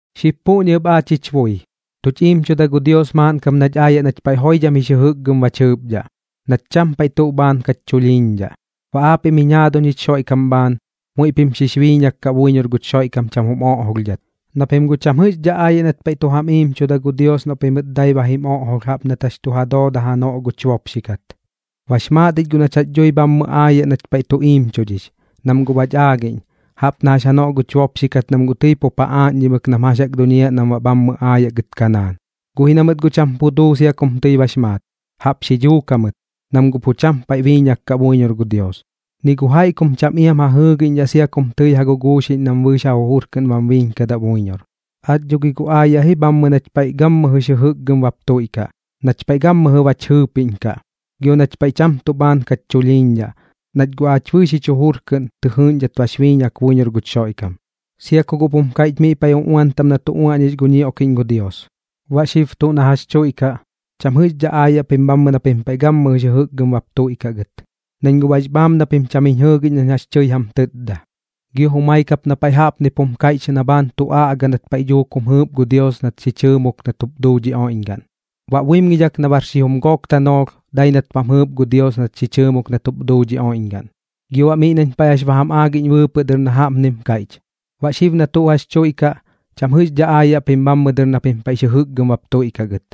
Xib puꞌñi ɨp aach jich bui, tuch iimchuda gu Dios maaꞌn kap nach aayaꞌ nach paiꞌ joidham jix jɨjɨkgɨm bach jɨɨpdhaꞌ, nach cham paiꞌ tuꞌ bhaan kach chulhiiñdhaꞌ. Baꞌ aapiꞌm jiñ jaaduñ jich Xoiꞌkam bhaan, muiꞌ pim xix biiñak kaꞌ buiñor guch Xoiꞌkam cham jum oꞌjolhdhat, na pim guꞌ cham jɨꞌxdhaꞌ aayaꞌ nat paiꞌ tu jam iimchuda gu Dios noꞌ pimɨt dai ba jim oꞌjolh jaꞌp nat jax tu ja dooda janoꞌ guch bopxi kat. Bax maat ich guꞌ nach jax jaꞌk dui bhammɨ aayaꞌ nach paiꞌ tu iimchudhix, nam guꞌ bach aagiꞌñ, jaꞌp na jax janoꞌ guch bopxi kat nam guꞌ tɨi pup ja aaꞌñdhimɨk nam jax jaꞌk duñiaꞌ nam baꞌ bhammɨ aayaꞌ gɨt Kanaan. Guꞌ ji na mɨt guꞌ cham pu duu sia kum tɨi bax maat. Jaꞌp xi dhuuk jamɨt, nam guꞌ pu cham paiꞌ biiñak kaꞌ buiñor gu Dios, ni gu jaiꞌ kum cham iam ja jɨɨgiꞌñdhaꞌ sia kum tɨi ja guguuxiꞌñ nam bɨɨx ja jujur kɨꞌn bam biiñkadaꞌ buiñor. Aach dho gi guꞌ aayaꞌ ji bhammɨ nach paiꞌ gammɨjɨx jɨjɨkgɨm bap tuiꞌkaꞌ, nach paiꞌ gammɨjɨ bach jɨɨpiꞌñkaꞌ, gio nach paiꞌ cham tuꞌ bhaan kach chulhiiñdhaꞌ, nach guꞌ aach bɨɨx jich jujur kɨꞌn tɨ jɨɨꞌñdhat bax biiñak buiñor guch Xoiꞌkam. Sia ku guꞌp jum kaiꞌch miꞌ paiꞌ uꞌuan taꞌm na tu uaꞌñix gu ñioꞌkiꞌñ gu Dios: Baꞌ xib tuꞌ na jax tuiꞌkaꞌ, cham jɨꞌxdhaꞌ aayaꞌ pim na pim paiꞌ gammɨjɨx jɨjɨkgɨm bap tuiꞌkaꞌ gɨt, nañ guꞌ bax bhaam na pim cham jiñ jɨɨgiꞌñ nañ jax tɨi jam tɨtda. Gio jumai kap na paiꞌ jaꞌpnip jum kaiꞌch na bhaan tu aꞌga nat paiꞌ dhuuk jum jɨɨp gu Dios nat xi chɨɨmok nat jup duu dhi oiꞌñgaꞌn: Baꞌ buimgidhak na bar xijum gook tanoolh, dai nat bam jɨɨp gu Dios nat xi chɨɨmok nat jup duu dhi oiꞌñgaꞌn. Gio baꞌ miꞌ nañ paiꞌ jax ba jam aagiꞌñ bɨɨpɨꞌ dɨr na jaꞌpnim kaiꞌch: Baꞌ xib na tuꞌ jax tuiꞌkaꞌ, cham jɨꞌxdhaꞌ aayaꞌ pim bhammɨ dɨr na pim paiꞌx jɨjɨkgɨm bap tuiꞌkaꞌ gɨt.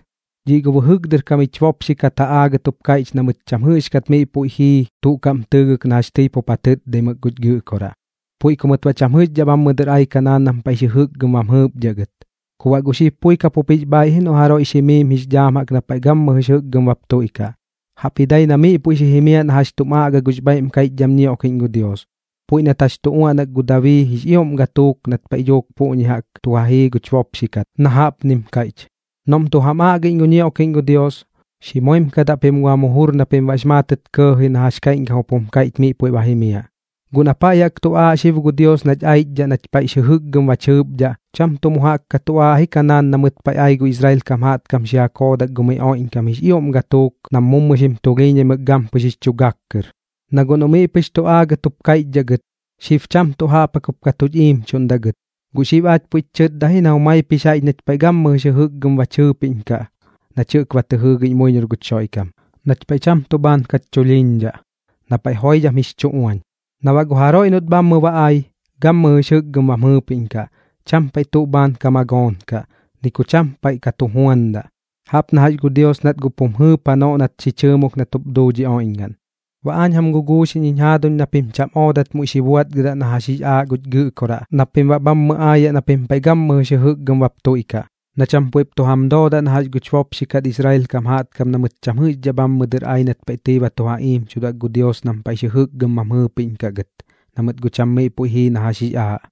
Dhiꞌ gu bɨjɨk dɨr kam jich bopxi kat ja aagɨt jup kaiꞌch na mɨt cham jɨꞌxkat miꞌ puiꞌ jii tuꞌ kaꞌm tɨɨgɨk na jax tɨi pup ja tɨtdaimɨk guch Gɨꞌkoraꞌ, puiꞌ ku mɨt baꞌ cham jɨꞌxdhaꞌ bhammɨ dɨr ai Kanaan nam paiꞌx jɨjɨkgɨm bam jɨɨpdhaꞌ gɨt. Ku baꞌ guꞌ xib pui kapup jix bhaaiꞌ ji noꞌ jaroiꞌx jimiim jix dhaam na paiꞌ gammɨjɨx jɨkgɨm bap tuiꞌkaꞌ, jaꞌpji dai na miꞌ puiꞌ xi jimiaꞌ na jax tum aꞌga gux bhaiꞌm kaiꞌchdham ñioꞌkiꞌñ gu Dios, puiꞌ nat jax tu uaꞌnak gu Dabii jix ioꞌm gatuuk nat paiꞌ dhuuk puꞌñi jaꞌk tu ja jii guch bopxi kat, na jaꞌpnim kaiꞌch: Noꞌm tu jam aꞌgiꞌñ gu ñioꞌkiꞌñ gu Dios, xi moimkadaꞌ pim gu jam jujur na pim baꞌx maatɨt kɇɇji na jax kaiꞌñkam jup jum kaiꞌch miꞌ puiꞌ ba jimiaꞌ. Guꞌ na paiꞌ jaꞌk tu aaꞌ xib gu Dios nach aichdhaꞌ nach paiꞌx jɨjɨkgɨm bach jɨɨpdhaꞌ, cham tuꞌ mu jaꞌk ka tu aaꞌ ji Kanaan na mɨt paiꞌ ai gu Israel kam jaꞌtkam xi ja koodak gu miꞌ oiꞌñkam jix ioꞌm gatuuk nam mu xim tulhiiñaimɨk gampɨx jix chu gak kɨr. Na guꞌ noꞌ miꞌ pɨx tu aagɨt jup kaiꞌchdhaꞌ gɨt, xib cham tuꞌ jaꞌp jaꞌk jup ka tuch iimchuꞌndaꞌ gɨt. Guꞌ xib aach puiꞌch chɨtda ji na jumaip jix jaiꞌch nach paiꞌ gammɨjɨx jɨjɨkgɨm bach jɨɨpiꞌñkaꞌ nach jɨꞌk ba tɨ jɨɨgiꞌñ buiñor guch Xoiꞌkam, nach paiꞌ cham tuꞌ bhaan kach chulhiiñdhaꞌ, na paiꞌ joidham jix chu uañ. Na baꞌ gu jaroiꞌ noꞌt bhammɨ ba ai, gammɨjɨx jɨkgɨm bam jɨɨpiꞌñkaꞌ, cham paiꞌ tuꞌ bhaan ka magoonkaꞌ, ni ku paiꞌ ka tu juandaꞌ, jaꞌp na jax gu Dios nat guꞌ pum jɨɨp janoꞌ nat xi chɨɨmok nat jup duu dhi oiꞌñgaꞌn. Baꞌ aañ jam guguuxiꞌñ jiñ jaaduñ na pim cham oodat muiꞌ xi buaꞌtgɨdaꞌ na jax jix aaꞌ guch Gɨꞌkoraꞌ na pim baꞌ bhammɨ aayaꞌ na pim paiꞌ gammɨjɨx jɨjɨkgɨm bap tuiꞌkaꞌ, na cham puiꞌp tu jam doodaꞌ na jax guch bopxi kat Israel kam jaꞌtkam na mɨt cham jɨꞌxdhaꞌ bhammɨ dɨr ai nat paiꞌ tɨi ba tu ja iimchudak gu Dios nam paiꞌx jɨjɨkgɨm bam jɨɨpiꞌñkaꞌ gɨt, na mɨt guꞌ cham miꞌ puiꞌ jii na jax jix aaꞌ.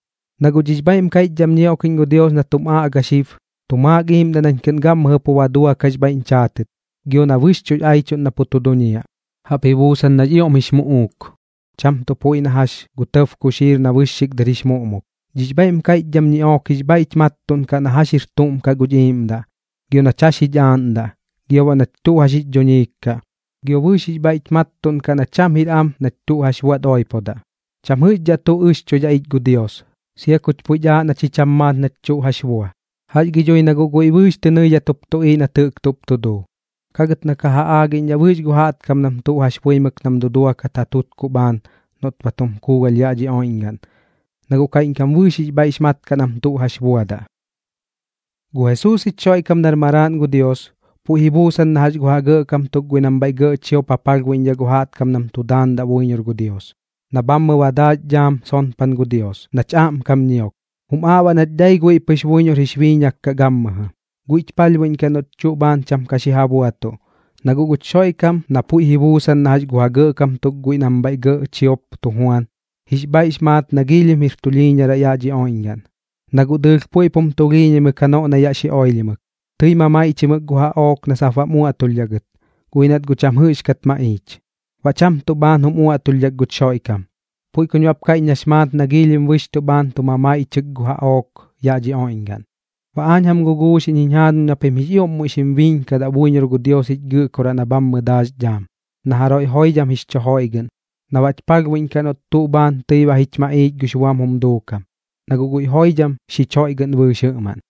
Na guꞌ dhix bhaiꞌm kaiꞌchdham ñioꞌkiꞌñ gu Dios na tum aꞌga xib, tu maak iimdaꞌ nañ kɨꞌn gammɨjɨ pu ba duakaꞌx bhaiꞌñ chaatɨt, gio na bɨxchuꞌx aichuꞌn na pu tu duñiaꞌ. Jaꞌp ji buusan nax ioꞌm jix muꞌuuk, cham tuꞌ puiꞌ na jax gu tɇb kuxiir na bɨxxik dɨr jix muꞌmuk. Dhix bhaiꞌm kaiꞌchdham ñiꞌook jix bhaiꞌch mattuꞌnkaꞌ na jax jir tuꞌm kaꞌ guch iiꞌmdaꞌ, gio nach jax jich aaꞌndaꞌ, gio baꞌ nach tuꞌ jax jix dhuñiik kaꞌ, gio bɨɨx jix bhaiꞌch mattuꞌnkaꞌ na cham jir am nach tuꞌ jax buaꞌt oipodaꞌ. Cham jɨꞌxkat tuꞌ ɨxchoidhaꞌ ich gu Dios, sia kuch puiꞌch aaꞌ na chi cham maat nach tuꞌ jax bua. Jax gi dhui na guꞌ guiꞌ bɨɨx tɨ nɨidhat jup tuꞌiiꞌ nat jɨꞌk tuꞌp tu duu. Kagɨt na guꞌ ka ja aagiꞌñdhaꞌ bɨɨx gu jaꞌtkam nam tuꞌ jax buimɨk nam duduakat ja tutkuꞌ bhaan noꞌt ba tum kuugalh yaꞌ dhi oiꞌñgaꞌn, na guꞌ kaiꞌñkam bɨɨx jix bhaiꞌx mat kaꞌ nam tuꞌ jax buadaꞌ. Gu Jesuus jich Xoiꞌkam nar Maraaꞌn gu Dios, puiꞌ ji buusan na jax gu ja gɇꞌkam tuk guiꞌ nam bhaiꞌ gɇꞌ chiop ja palhbuiꞌñdhaꞌ gu jaꞌtkam nam tu daandaꞌ buiñor gu Dios, na bhammɨ ba daax dhaam sonpan gu Dios, nach aꞌmkam ñiok. Jum aaꞌ baꞌ nach dai guiꞌ pɨx buiñor jix biiñak kaꞌ gammɨjɨ. Guiꞌch palhbuiꞌñkaꞌ noꞌch tuꞌ bhaan cham ka xi ja buatuꞌ, na guꞌ guch Xoiꞌkam na puiꞌ ji buusan na jax gu ja gɇꞌkam tuk guiꞌ nam bhaiꞌ gɇꞌ chiop tu juan, jix bhaiꞌx maat na giilhim jir tulhiiñaraꞌ yaꞌ dhi oiꞌñgaꞌn, na guꞌ dɨɨlh puiꞌp jum tulhiiñaimɨk janoꞌ na yaꞌ xi oilhimɨk. Tɨi mamaiꞌchimɨk gu jaꞌook na sap baꞌm uaꞌtulhdhaꞌ gɨt, guꞌ ji nat guꞌ cham jɨꞌxkat maꞌiich. Baꞌ cham tuꞌ bhaan jum uaꞌtulhdhak guch Xoiꞌkam, puiꞌ kuñ baꞌp kaiꞌch nax maat na giilhim bɨxchuꞌ bhaan tu mamaiꞌchɨk gu jaꞌook yaꞌ dhi oiꞌñgaꞌn. Baꞌ aañ jam guguuxiꞌñ jiñ jaaduñ na pim jix ioꞌm muiꞌ xim biiñkadaꞌ buiñor gu Dios jich Gɨꞌkoraꞌ na bhammɨ daax dhaam, na jaroiꞌ joidham jix chu joiꞌgɨꞌn, na baꞌch palhbuiꞌñkaꞌ noꞌt tuꞌ bhaan tɨi ba jich maꞌiich gux buam jum duukam, na guꞌ guiꞌ joidham xich joiꞌgɨꞌn bɨɨx jɨꞌmaꞌn.